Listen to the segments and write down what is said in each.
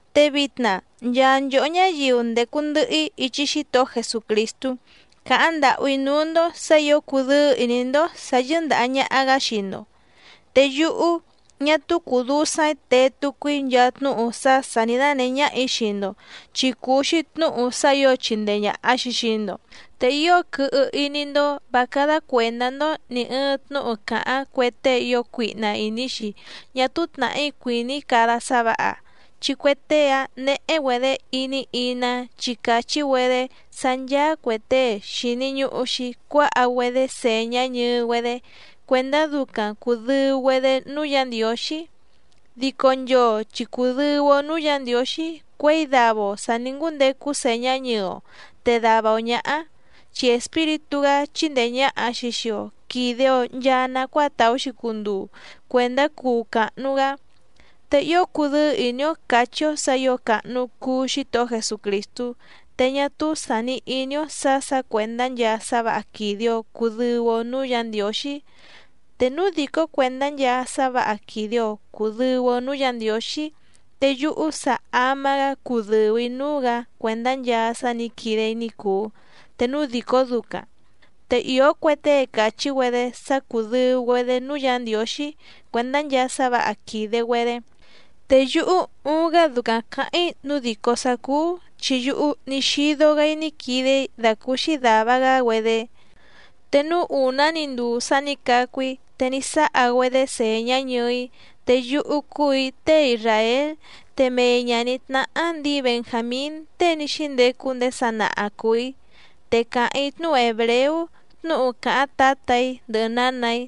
Te vitna nchaa nchòhó ñáyiu ndècu ndɨhɨ‑í ichi Xítohó Jesucrìstú càháⁿ ndàhú‑í núú‑ndó sǎ ǐo cudɨ́ɨ́ ìní‑ndó sǎ yɨ́ndàha ñaha‑gá xii‑ndo. Te yúhú ñá túú cùu dusaⁿ‑í tee tucu‑í nchaa tnúhu sá sà ní dánèhé ñáhà‑í xii‑ndo, chi cùu‑xi tnúhu sá ǐo chìndee ñaha‑xi xii‑ndo. Te ío quɨhɨ iní‑ndó vǎ cádá cuèndá‑ndó nì ɨɨⁿ tnúhu càháⁿ cue tée ío cuihna ìní‑xi ñá túú tnàhí cuìní cada sá vǎha, chi cue tée‑áⁿ néhé‑güedě iní iná chi càchí‑güedé sá ncháá cuè tée xìni ñuhu‑xi cuáha‑güedé sèñá ñɨɨ‑güedé cuèndá ducaⁿ cùdɨu‑güedé núú Yǎ Ndiǒxí. Dico nchoo chi cùdɨu‑o núú Yǎ Ndiǒxí cuěi dava‑o sà ní ngúndecu sèñá ñɨɨ‑o te dava‑o ñǎhá, chi Espíritú‑gá chíndèe ñaha‑xi xii‑o quide‑o nchaa nacuáa tàú‑xi cunduu cuèndá cuu càhnu‑gá. Te ío cùdɨ́ɨ́ ìní‑ó càchí‑ó sǎ ǐo càhnu cuu Xítohó Jesucrìstú, te ñá túú sàni iní‑ó sǎ sǎ cuèndá nchaa sá vǎha quìde‑o cudɨu‑o núú Yǎ Ndiǒxí. Te núu dìcó cuèndá nchaa sá vǎha quìde‑o cudɨu‑o núú Yǎ Ndiǒxí, te yúhú sa ama‑gá cudɨ̀u‑í núú‑gǎ cuèndá nchaa sá nǐ quide‑í ní cùu te núu dìcó ducaⁿ. Te ìó cue tée càchí‑güedé sá cùdɨu‑güedé núú Yǎ Ndiǒxí cuèndá nchaa sá vǎha quìde‑güedé. Te yúhú uuⁿ‑gá ducaⁿ cǎháⁿ‑í nǔu dìcó sá cúú chi yúhú ní xídó‑gǎ‑í ní quide‑í dàcúúxí dàva‑gá‑güedé. Te núú ùná‑ni nduu sá nǐ cacu‑í te ní sáha‑güedé sèñá ñɨɨ‑í, te yúhú cúù‑í tée isràél, te mei ñàní tnáhá ndǐi Benjàmín tée ní xíndecu ndéé sanaha cùu‑í. Te càháⁿ‑í tnúhu hèbreú tnúhu càháⁿ tǎtà‑í ndɨhɨ nǎnà‑í,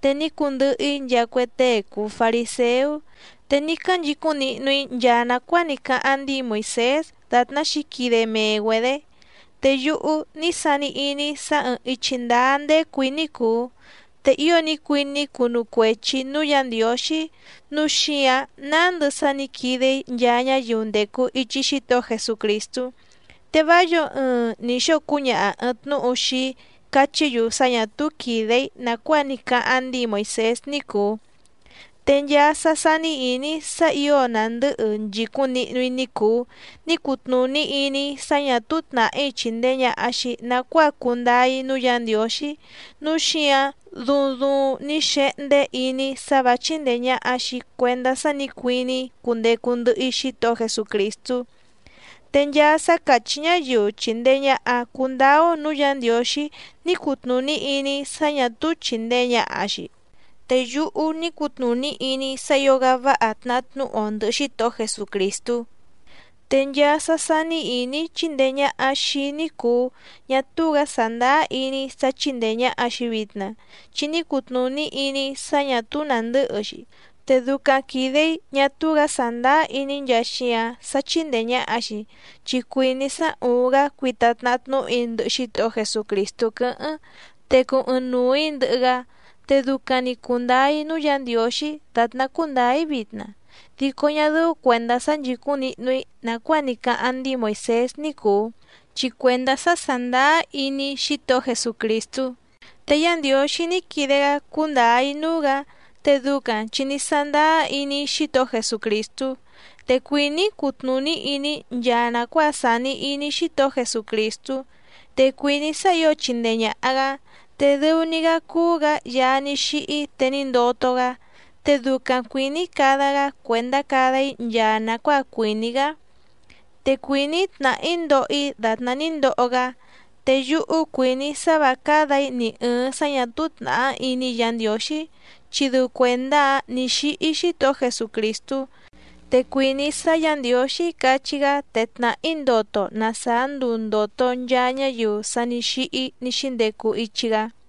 te ní cundɨhɨ‑í nchaa cue tée cùu fariséú, te ní cánchicúⁿ nihnu‑í nchaa nàcuáa ní cáháⁿ ndíi Moìsés dàtná xǐquide mee‑güedě. Te yúhú ní sani iní‑í sá ɨ̀ɨⁿ ichi ndáá ndécù‑í ní cùu, te ío ní cuiní‑í cunu cuechi‑ǐ núú Yǎ Ndiǒxí, núu xíǎⁿ nándɨ sá nǐ quide‑í nchaa ñáyiu ndècu ichi Xítohó Jesucrìstú, te vá yǒo ɨɨⁿ ni xóo cúñaha ɨ̀ɨⁿ tnúhu xii‑í cachí‑yu sá ñà túú quìde‑í nàcuáa ní cáháⁿ ndíi Moìsés ní cùu. Te nchaa sá sání ìní‑í sá ǐo nàndɨ́hɨ nchìcúⁿ nihnu‑í ní cùu, ní cutnùní iní‑í sá ñà túú tnàhí chìndee ñaha‑xi nacuáa cundáá‑í núú Yǎ Ndiǒxí, núu xíǎⁿ duuⁿ duuⁿ ní xehndé iní‑í sá vǎ chíndèe ñaha‑xi cuendá sá nǐ cuiní‑í cundecu ndɨhɨ‑í Xítohó Jesucrìstú. Te nchaa sá càchí ñáyiu chìndee ñaha cundáá‑ó nǔú Yǎ Ndiǒxí ní cutnùní iní‑í sá ñà túú chìndee ñaha‑xi. Te yúhú ní cutnùní iní‑í sá ǐo‑gá váha tnahá tnúhu‑o ndɨ̀hɨ Xítohó Jesucrìstú. Te nchaa sá sání ìní‑í chíndèe ñaha xii‑í ní cùu, ñá túú‑gǎ sàndáá iní‑í sá chíndèe ñaha‑xi vitna chi ní cutnùní iní‑í sá ñà túú nàndɨ́hɨ‑xi. Te ducaⁿ quìde‑í ñá túú‑gǎ sàndáá iní‑í nchaa xíǎⁿ sá chíndèe ñaha‑xi, chi cuìní‑í sá úúⁿ‑gǎ cuita tnahá tnúhu‑í ndɨhɨ Xítohó Jesucrìstú quɨ́hɨ́ⁿ, te cuu ɨɨⁿnuu‑ǐ ndɨhɨ‑gá, te ducaⁿ‑ni cùndáá‑í núú Yǎ Ndiǒxí dàtná cúndǎá‑í vitna, dico ñá dɨ́ú cuèndá sá nchìcúⁿ nihnu‑í nàcuáa ní cáháⁿ ndíi Moìsés ní cùu, chi cuèndá sá sàndáá iní‑í Xítohó Jesucrìstú. Te Yá Ndiǒxí ní quide‑gá cúndǎá‑í núú‑gǎ, te ducaⁿ chi ní sándáá iní‑í Xítohó Jesucrìstú. Te cuìní‑í cutnùní iní‑í nchaa nàcuáa sàni iní Xítohó Jesucrìstú, te cuìní‑í sá ǐo chindee ñàha‑gá, te dɨu‑ni‑gá cúú‑gǎ Yaá ní xíhí te ní ndoto‑gá, te ducaⁿ cuìní‑í cada‑gá cuèndá cada‑í nchaa nàcuáa cuìní‑gá. Te cuìní‑í tnàhá‑í ndoho‑í dàtná ní ndoho‑gá. Te yúhú cuìní‑í sá vǎ cádà‑í ni ɨ̀ɨⁿ sá ñà túú tnàhá iní Yǎ Ndiǒxí, chi dɨu cuèndá‑áⁿ nǐ xíhí Xítohó Jesucrìstú. Te cuìní‑í sá Yǎ Ndiǒxí cachí‑gá te tnàhá‑í ndoto na sàá nduu ndòto nchaa ñáyiu sa ní xíhí ní xíndecu ichi‑gá.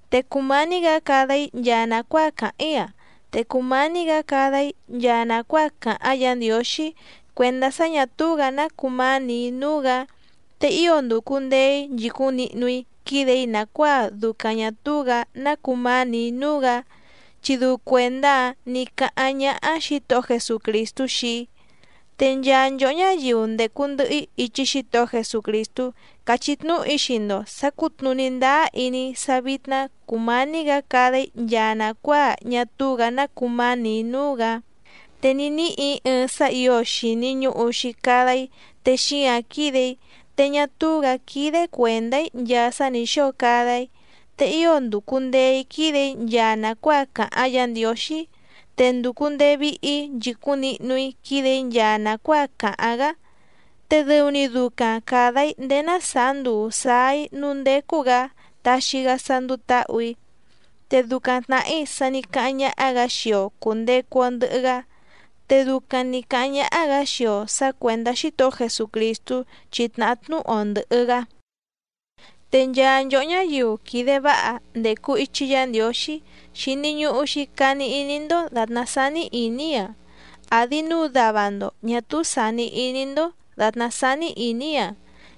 Te cùmání‑gǎ cada‑í nchaa nàcuáa càháⁿ‑í‑a, te cumání‑gǎ cada‑í nchaa nàcuáa càháⁿ Yǎ Ndiǒxí cuèndá sá ñà túú‑gǎ ná cumánì‑í núú‑gǎ. Te ío ndùcu ndee‑í nchìcúⁿ nihnu‑í quídè‑í nàcuáa ducaⁿ ñà túú‑gǎ ná cumánì‑í núú‑gǎ, chi dɨu cuèndá‑áⁿ nǐ cáháⁿ ñáhá Xǐtohó Jesucrìstú xii‑í. Te nchaa nchòhó ñáyiu ndècu ndɨhɨ‑í ichi Xítohó Jesucrìstú càchí tnúhu‑í xii‑ndo sǎ cùtnuní ndáá iní‑í sá vítná cùmání‑gǎ cada‑í nchaa nàcuáa ñá túú‑gǎ ná cumánì‑í núú‑gǎ. Te ní níhì‑í ɨɨⁿ sá ǐo xìni ñuhu‑xi cada‑í te xíǎⁿ quídè‑í, te ñá túú‑gǎ quídé cuèndá‑í nchaa sá nǐ xóo cada‑í, te ío ndùcu ndee‑í quídè‑í nchaa nàcuáa càháⁿ Yǎ Ndiǒxí. Te ndùcu ndee vihi‑í nchìcúⁿ nihnu‑í quídè‑í nchaa nàcuáa càháⁿ‑gá, te dɨu‑ni ducaⁿ càda‑í ndéé ná sàá nduu sǎá‑í núú ndécú‑gǎ taxi‑gá sá ndúú tǎhù‑í. Te ducaⁿ tnàhí sa ní cáháⁿ ñáhá‑gǎ xii‑o cùndecu‑o ndɨhɨ‑gá, te ducaⁿ nǐ cáháⁿ ñáhá‑gǎ xii‑o sǎ cuèndá Xítohó Jesucrìstú chi tnàhá tnúhu‑o ndɨ̀hɨ‑gá. Te nchaa nchòhó ñáyiu quìde váha ndècu ichi Yá Ndiǒxí xìni ñuhu‑xi cani iní‑ndó dàtná sání ìní‑í‑a, àdi núu dava‑ndo ñà túú sàni iní‑ndó dàtná sání ìní‑í‑a,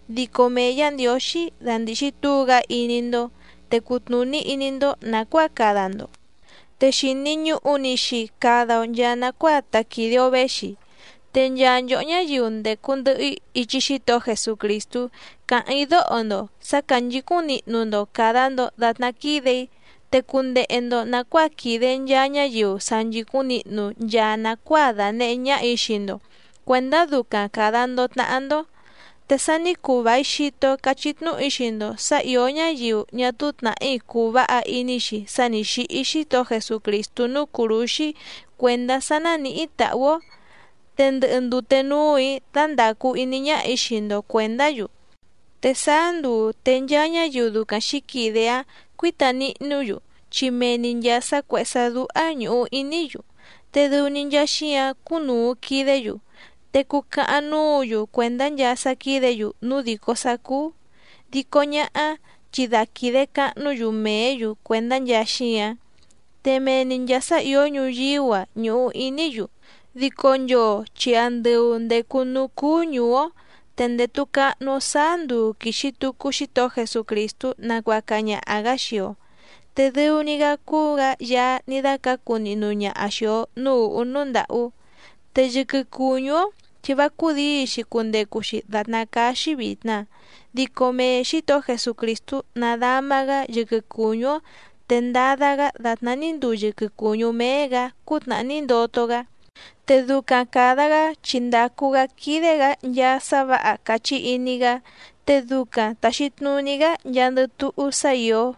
dico mee Yǎ Ndiǒxí dandìxi túu‑gá iní‑ndó te cutnùní iní‑ndó nàcuáa cada‑ndo. Te xìni ñuhu‑ni‑xi cada‑o nchaa nacuáa ta quìde‑o véxi. Te nchaa nchòhó ñáyiu ndècu ndɨhɨ‑í ichi Xítohó Jesucrìstú càháⁿ‑í dóho‑ndo sǎ cánchǐcúⁿ nihnu‑ndo càda‑ndo datná quídè‑í. Te cundehe‑ndo nàcuáa quìde nchaa ñáyiu sa nchìcúⁿ nihnu nchaa nàcuáa dànehé ñáhà‑í xii‑ndo cuèndá ducaⁿ càda‑ndo tnahá‑ndó. Te sa ní cuu vài xito cachí tnúhu‑í xii‑ndo sǎ ìó ñáyiu ñá túú tnàhí cùu váha iní‑xi sá nǐ xíhí Xítohó Jesucrìstú núú cùrúxí cuèndá sá nánìhí tàhú‑ó. Te ndɨhɨ ndute núù‑í dándàcu iní ñáhà‑í xii‑ndo cuèndá‑yu. Te sáá nduu te nchaa ñáyiu ducaⁿ xǐquide‑áⁿ cuǐta nihnú‑yu, chi mee‑ni nchàa sá cuèhé sá dúhá ñùhu iní‑yu te dɨu‑ni nchaa xíǎⁿ cúnùu quidé‑yu, te cucahaⁿ núǔ‑yu cuèndá nchaa sá quídě‑yu núu dìcó sá cúú, dico ñáhá chi da quìde cahnú‑yu mèé‑yu cuèndá nchaa xíǎⁿ. Te mee‑ni nchàa sá ìó ñuyíú‑a ñùhu iní‑yu. Dico nchoo chi andɨu ndècu núú cúú ñùú‑ó, te ndètu cahnu‑o sáá nduu quìxi tucu Xítohó Jesucrìstú nacuaca ñaha‑gǎ xii‑o. Te dɨu‑ni‑gá cúú‑gǎ Yaá ní dácǎcu nihnu ñaha xìi‑o núú ùhú núú ndàhú. Te yɨquɨ cùñú‑ó chi vá cúdǐi‑xi cundecu‑xi dàtná cáá‑xí vìtna, dico mee Xǐtohó Jesucrìstú nadama‑gá yɨquɨ cùñú‑ó te ndada‑gá dàtná ní nduu yɨquɨ cùñú méé‑gǎ cútnàhá ní ndoto‑gá. Te ducaⁿ càda‑gá chi ndàcu‑gá quídé‑gǎ nchaa sá vǎha càchí iní‑gá, te ducaⁿ tàxi tnuní‑gá nchaandɨ túhú sá ìó.